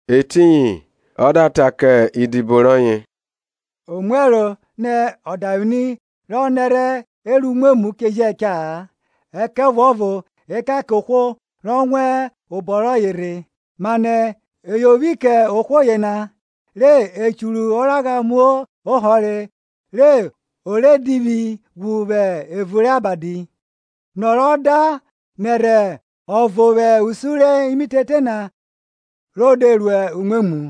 Etiyin ọ da ta kẹ idibo rọye, Omuẹro nẹ ọdavwini rọ nẹrhẹ e ru umwemwu che jẹ cha-a; ẹkẹvuọvo ekan kẹ ohwo rọ wan obọ rọye rhe. Manẹ e yovwi kẹ ohwo yena re o churu oragha mu ohọre re o re divwi ghwu vwẹ evun rẹ abadi, nọ rọ da nẹrhẹ ọvo vwẹ usun rẹ imitete na ro de ru umwemwu.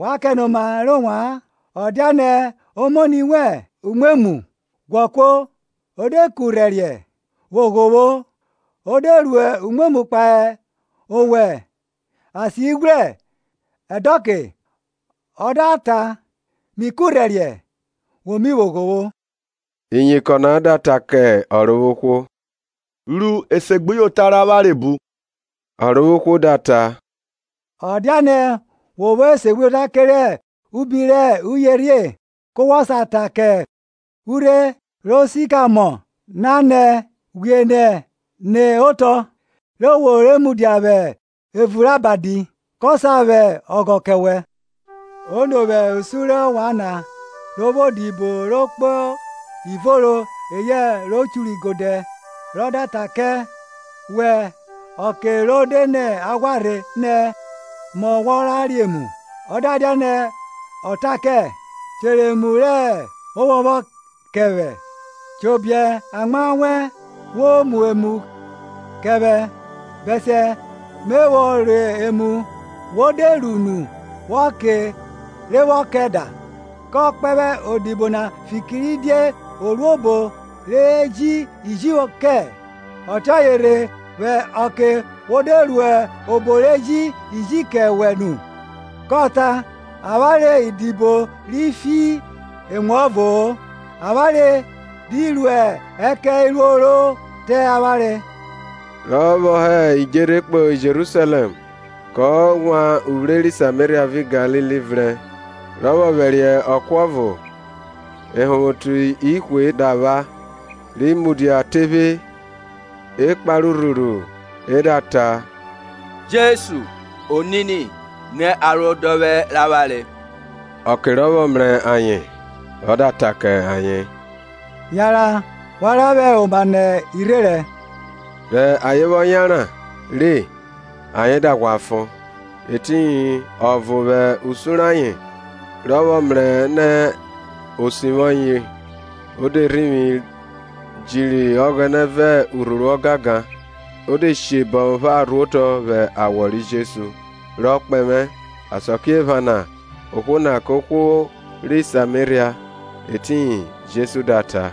Wa kẹnoma rẹ ovwan; ọ dianẹ omoni wẹn ru umwemwu, ghwọ kuo, o de ku rhẹriẹ, vwo ghovwo; o de ru umwemwu kpahe owẹ asieghwrẹ ẹdọke, ọ da ta, Mi kurhẹriẹ, wo mi vwo ghovwo. Iyinkọn na da ta kẹ Ọrovwohwo, Ru esegbuyota rẹ avwanre bu! Ọrovwohwo da ta, ọ dianẹ wo vwo esegbuyota kerẹ ubi rẹ uyerhie, ku wọ sa ta kẹ urhe ri sikamọ nana nẹ, Ghwie nẹ ne otọ, re wo re mudia vwẹ evun rẹ abadi, ko sa vwẹ ọghọ kẹ wẹ. Ono vwẹ usun rẹ ovwan na, ro vwo odibo ro kpo ivoro eyẹ ro churu igodẹ, rọ da ta kẹ vwẹ ọke rọ de nẹ aghwa rhe nẹ, Mọ wọ re emu? Ọ dianẹ o ta kẹ, Chere emu rẹ ovwọnvwọn kẹ vwẹ, chobiẹ amwa wẹn wo mu emu kẹ vwẹ, bẹsiẹ me vwọ re nu me vwọ da nu; wo de ru nu wo ke re wọ ke da? Kọ kpẹvwẹ odibo na fikiridie o ru obo re ji iji kẹ? Ọtiọye rhe, vwẹ ọke wo de ru obo re ji iji kẹ wẹ nu, kọ ta, Avwanre idibo ri fi emuọvo-o; avwanre di ru ẹkẹn iruo ro te avwanre. Rọ vwọ hẹ idjerhe kpọ Jerusalẹm kọ wan uvwre ri Sameria vẹ Galili vrẹn. Rọ vwọ vwẹriẹ ọko ọvo, ehọnvwoti ihwe da vwa, ri mudia tephe. e kpare urhuru e da ta, Jesu, Onini, ni arodọvwẹ rẹ avwanre. Ọke rọ vwọ mrẹ ayen ọ da ta kẹ ayen, yanran wa ra vwẹ oma nẹ irherẹn. Rẹ ayen vwọ yanran re ayen da ghwa fon. Etiyin ọvo vwẹ usun rẹ ayen, rọ vwọ mrẹ nẹ o sivwi ọye, o de rhivwi jiri Ọghẹnẹ vẹ urhuru ọgangan; o de she bọvwọn opharo rhuotọ vwẹ awọ ri Jesu, rọ kpẹvwẹ. Asakiephana ohwo na kẹ ohwo ri Sameria. Etiyin Jesu da ta,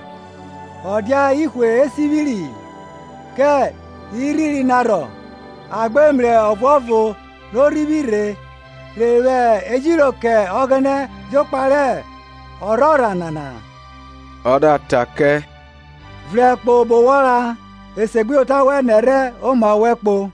Ọ dia ihwe e sivwiri? Kẹ irhiri na rhọ? A gbe mrẹ ọvuọvo ro rhivwi rhe rhe vwẹ ejiro kẹ Ọghẹnẹ jokpa rẹ ọrhorha nana-a? Ọ da ta kẹ, Vrẹn kpo obo wọ ra; esegbuyota wẹn nẹrhẹ oma wẹ kpo.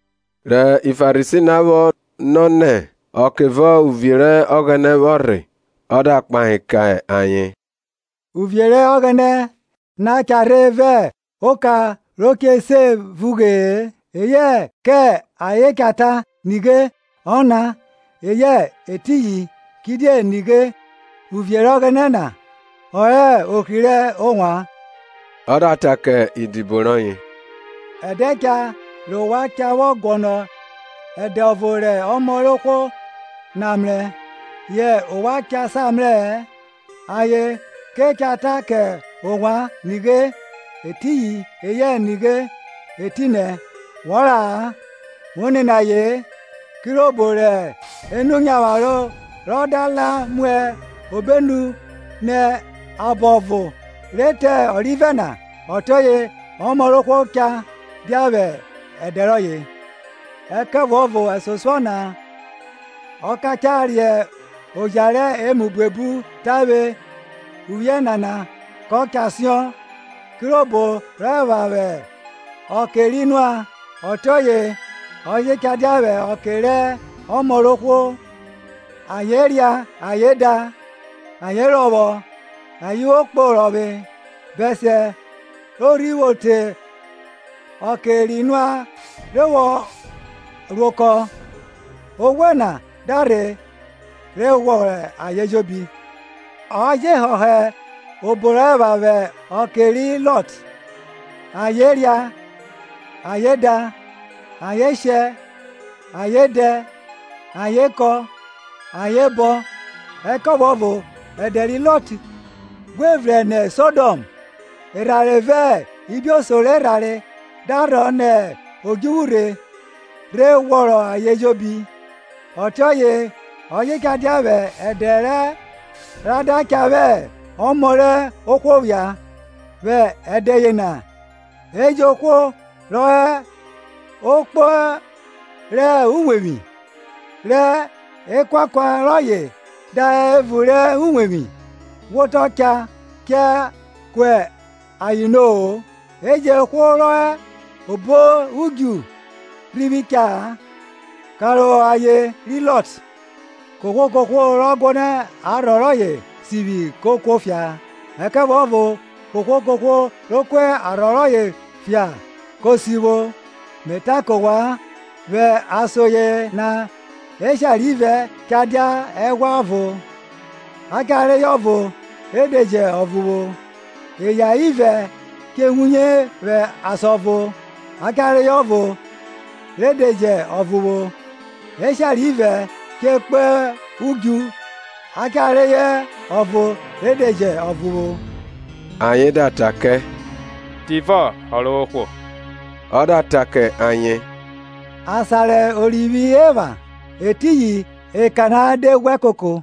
Rẹ Farisi vwọ nọ nẹ ọkevọ uvie rẹ Ọghẹnẹ vwọ rhe, ọ da kpahe kẹ ayen, Uvie rẹ Ọghẹnẹ na cha rhe vẹ oka re che se vughee; eyẹ kẹ ayen cha ta, Nighe, ọna! eyẹ Etiyin i kidie nighe, uvie rẹ Ọghẹnẹ na ọ hẹ ohri rẹ ovwan. Ọ da ta kẹ idibo rọye, Ẹdẹ cha rẹ ovwan cha vwọ guọnọ ẹdẹ ọvo rẹ Ọmọ rẹ ohwo na mrẹ, yẹ ovwan cha sa mrẹ-ẹ. Ayen ke cha ta ke ovwan, Nighe, etiyin! eyẹ Nighe, etinẹ! Wọ ra-a, wo nene aye-en. Kirobo rẹ enu nyavwaro rọ da la mu obenu nẹ abọ ọvo re te ọrivẹ na, ọtiọye Ọmọ rẹ ohwo cha dia vwẹ ẹdẹ rọye. Ẹkẹvuọvo ẹsosuọ na ọ ka cha re oja rẹ emu buebu tavwe uvwiẹ nana kọ cha siọn. Kirobo rọ epha vwẹ ọke ri Noa, ọtiọye ọ je cha dia vwẹ ọke rọ Ọmọ rọ ohwo. Ayen ria, ayen da, ayen rọvwọ, ayen vwo kpo orọvwe, bẹsiẹ ro rhi vwo te ọke ri Noa rhe vwọ ro okọ, oghwe na da rhe rhe ghwọrọ ayen ejobi. Ọ je họhọ obo rọ epha vwọ ọke ri Lọt–ayen ria, ayen da, ayen shẹ, ayen dẹ, ayen kọn, ayen bọn, ẹkẹvuọvo ẹdẹ ri Lọt ghwe vrẹn nẹ Sodọm, erhanre vẹ ibioso rẹ erhanre da rhọ nẹ odjuvwu rhe rhe ghwọrọ ayen ejobi– ọtiọye ọ je cha dia vwọ ẹdẹ ra da cha vwọ Ọmọ rọ ohwo phia. Vwọ ẹdẹ yena, e jẹn ohwo rọ họ okpo rọ uwevwi, rọ ekuakua rọye da họ evun rọ uwevwi, wotọ cha cha kua ayen no-o; e jẹn ohwo rọ họ obo udju rhivwi cha-a. Karohọ aye ri Lọt. Kohwo kohwo rọ guọnọ arhọ rọye sivwi ko kuofia, ẹkẹvuọvo kohwo kohwo ro ku arhọ rọye fia ko sivwo. Me ta kọ ovwan, vwọ ason yena eshare ivẹ cha dia ehwa ọvo; a cha reyọ ọvo re de jọ ọvo vwo. Eya ivẹ che wuye vwọ asan ọvo; a cha reyọ ọvo re de jẹ ọvo vwo. Eshare ivẹ che kpo udju, a cha reyọ ọvo re de je ọvo vwo. Ayen da ra kẹ, Tivọ vwo Ọrovwohwo? Ọ da ta kẹ ayen, Asan rẹ orivwi epha, etiyin ekana da ghwẹ koko.